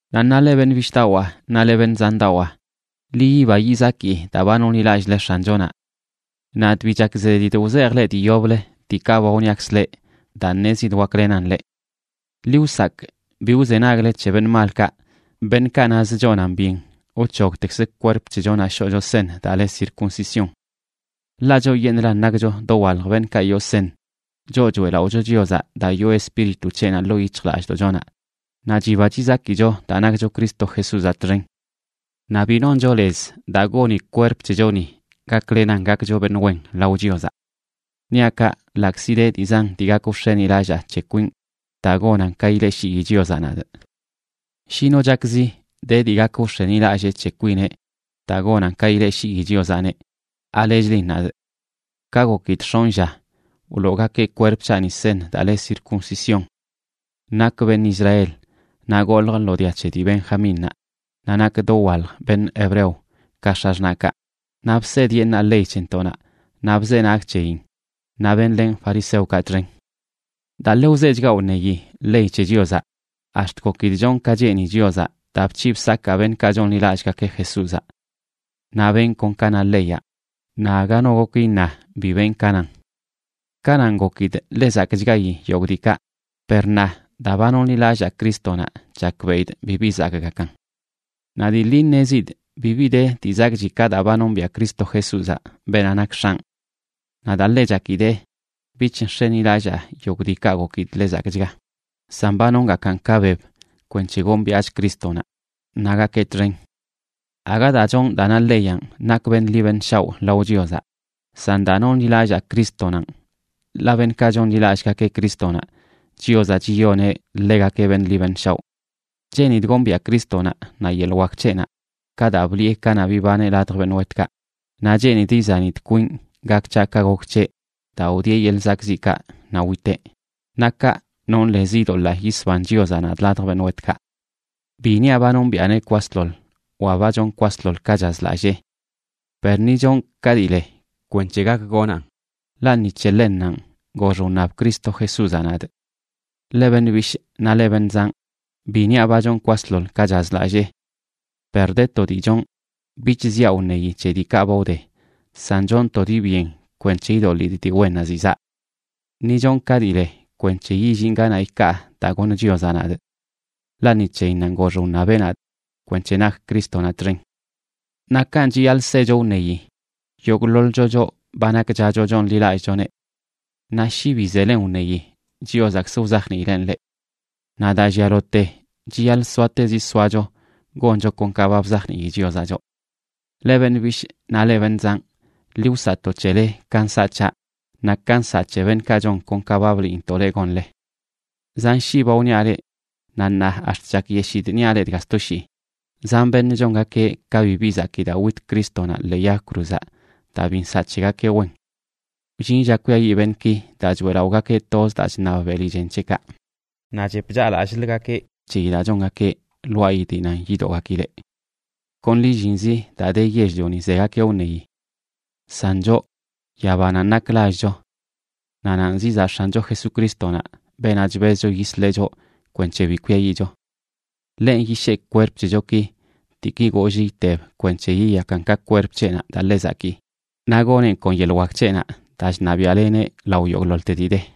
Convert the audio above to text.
Naꞌ ṉaa, leꞌ beṉꞌ bishꞌdawaa naꞌ leꞌ beṉꞌ zandawaa, ḻi yiba yizaki daa ba nonḻilallꞌle X̱anchonaꞌ. Nadꞌ bi chak zedidꞌ wzejꞌ leꞌ dii yoblə diikaꞌ ba wniakzꞌ leꞌ daa ṉezidꞌ waklenan leꞌ. Ḻi wsakꞌ bi wzenagle c̱he beṉꞌ malkaꞌ, beṉꞌkaꞌ nazə chonan byen wc̱hogtekzə kwerp c̱hechonaꞌ shoꞌcho seṉ daa le circuncisión. Ḻaꞌ choꞌyeṉꞌlan nakcho dowalj beṉꞌkaꞌ yoo seṉ, choꞌ choeꞌlaꞌocho Chiozaꞌ daa yoo Espíritu c̱heꞌnaꞌ ḻoo yic̱hjlallꞌdoꞌchonaꞌ naꞌ chiba chizakicho daa nakcho Cristo Jesúzaꞌ txen. Naꞌ bi noncho lez daa goni kwerp c̱hechoni gaklenan gakcho beṉꞌ wen lao Chiozaꞌ. Niaꞌ kaꞌ ḻaꞌkzi de dii zan dii gak wx̱enilallaa c̱he kwinꞌ daa gonan ka ileꞌshii Chiozaꞌ nadꞌ. Shi no chakzi de dii gak wx̱enilallee c̱he kwineꞌ daa gonan ka ileꞌshii Chiozaꞌneꞌ, ¿alechlin nadꞌ? Ka gokidꞌ x̱onꞌ lla, wloogakeꞌ kwerp c̱haꞌni seṉ daa le circuncisión. Nakꞌ beṉꞌ Israel, naꞌ goljꞌ lo dia c̱he dii Benjamínnaꞌ, naꞌ nakꞌ dowalj beṉꞌ hebreo ka x̱axṉaꞌkaꞌ, naꞌ bsedyeṉaa ley c̱hentoꞌnaꞌ naꞌ bzenagꞌ c̱heyin, naꞌ benlenꞌ fariseokaꞌ txen. Daa ḻe wzechgaꞌ wṉeyi ley c̱he Chiozaꞌ, ax̱t gokidꞌ chonꞌ ka cheeni Chiozaꞌ daa bc̱hiꞌ bsakaa beṉꞌkaꞌ chonḻilallꞌgakeꞌ Jesúzaꞌ. Naꞌ benꞌ kon ka na leyaꞌ, naꞌ aga no gok iṉa bi benꞌ ka nan. Kanaꞌn gokidꞌ ḻe zakꞌchgayi yogꞌ diikaꞌ, per ṉaa, daa ba nonḻilallaa Crístonaꞌ, chakbeꞌidꞌ bibi zakꞌgakan. Naꞌ dii ḻi ṉezidꞌ bibi de dii zakꞌchi ka daa ba nombiaꞌ Cristo Jesúzaꞌ, beenaꞌ nak X̱anꞌ. Naꞌ daa ḻe chakidee, bich nx̱enilallaa yogꞌ diikaꞌ gokidꞌ ḻe zakꞌchga, san ba nongakaꞌn ka beb kwenc̱he gombiaꞌchꞌ Crístonaꞌ naꞌ gakee txen. Aga daa chonꞌ daa na leyanꞌ nakꞌ beṉꞌ ḻi beṉꞌ shaoꞌ lao Chiozaꞌ, san daa nonḻilallaa Crístonanꞌ, ḻaꞌ beṉꞌkaꞌ chonḻilallꞌgakeꞌ Crístonaꞌ, Chiozaꞌ chiyoneꞌ ḻegakeꞌ beṉꞌ ḻi beṉꞌ shaoꞌ. Cheenidꞌ gombiaꞌ Crístonaꞌ naꞌ yeḻꞌ wak c̱heꞌnaꞌ ka daa bliꞌe kanaꞌ bibaneꞌ ladj beṉꞌ wetkaꞌ, naꞌ cheenidꞌ izanidꞌ kwinꞌ gak c̱haꞌ ka gok c̱heꞌ daa wdieꞌ yeḻꞌ zakꞌziꞌkaꞌ naꞌ witeꞌ. Naꞌ kaꞌ, nonꞌ lez idoḻaa yisban Chiozaꞌ nadꞌ ladj beṉꞌ wetkaꞌ. Bi niaꞌ ba nombiꞌaneꞌ kwasḻoḻ wa ba chonꞌ kwasḻoḻ ka chazlallee. Per ni chonꞌ ka dii le kwenc̱he gak gonaꞌn, ḻaꞌ ni c̱he ḻennanꞌ gox wṉab Cristo Jesúzaꞌ nadꞌ. Leꞌ beṉꞌ bishꞌ naꞌ leꞌ beṉꞌ zanꞌ, bi niaꞌ ba chonꞌ kwasḻoḻ ka chazlallee. Per de to dii chonꞌ, bich ziaꞌ wṉeyi c̱he diikaꞌ ba wde, san chonꞌ to dii byen kwenc̱he idoḻidꞌ dii wennaꞌ ziꞌ zaꞌ. Ni chonꞌ ka dii le kwenc̱he yillinꞌ ganaꞌ ikaa daa goṉ Chiozaꞌ nadꞌ. Ḻaꞌ ni c̱heyinnanꞌ gox wṉabeꞌ nadꞌ kwenc̱he nakꞌ Crístonaꞌ txen. Naꞌ kanꞌ chiyaḻꞌ secho wṉeyi yogꞌḻoḻcho, choꞌ ba nakchacho chonḻilallꞌchoneꞌ. Naꞌ shi bi zelen wṉeyi Chiozaꞌkzə wzajniileꞌn leꞌ. Naꞌ daa llialote chiyaḻꞌ soatezi soacho goncho kon ka ba bzajnii Chiozaꞌ choꞌ. Leꞌ beṉꞌ bishꞌ naꞌ leꞌ beṉꞌ zanꞌ, ḻi wsaꞌto c̱hele ka nsaꞌ c̱haꞌ, naꞌ ka nsaꞌ c̱he beṉꞌkaꞌ chon kon ka ba bliintoꞌ leꞌ gonle. Zan shii ba wniaꞌ leꞌ, naꞌ ṉaa ax̱t chakyeshidꞌ niaꞌ leꞌ dga sto shii, zan beṉꞌ chongakeꞌ ka bibi zakii daa wit Crístonaꞌ ḻee yag cruzaꞌ daa bi nsaꞌ c̱hegakeꞌ wen. Wllin lla kwiayiꞌ beṉꞌki daa choeꞌlaꞌogakeꞌ toz daa chṉab beli chen c̱heꞌkaꞌ, naꞌ chep chaꞌlallꞌlgakeꞌ c̱heyi daa chongakeꞌ lwaayi dii nan yidoꞌgakileꞌ. Kon lillinzi daa de yell-lioni zegakeꞌ wṉeyi. San choꞌ, yabananꞌ nak lallcho. Naꞌ nanꞌ zizaꞌ X̱ancho Jesucrístonaꞌ, beenaꞌ chbezcho yisleꞌ choꞌ kwenc̱he bi kwiayiꞌcho. Ḻenꞌ yishee kwerp c̱hechoki, diiki goollꞌ iteb, kwenc̱he yiyakan ka kwerp c̱heꞌnaꞌ daa ḻe zakii. Naꞌ goneꞌn kon yeḻꞌ wak c̱heꞌnaꞌ daa chṉabiaꞌleneꞌ lao yogꞌḻoḻte dii de.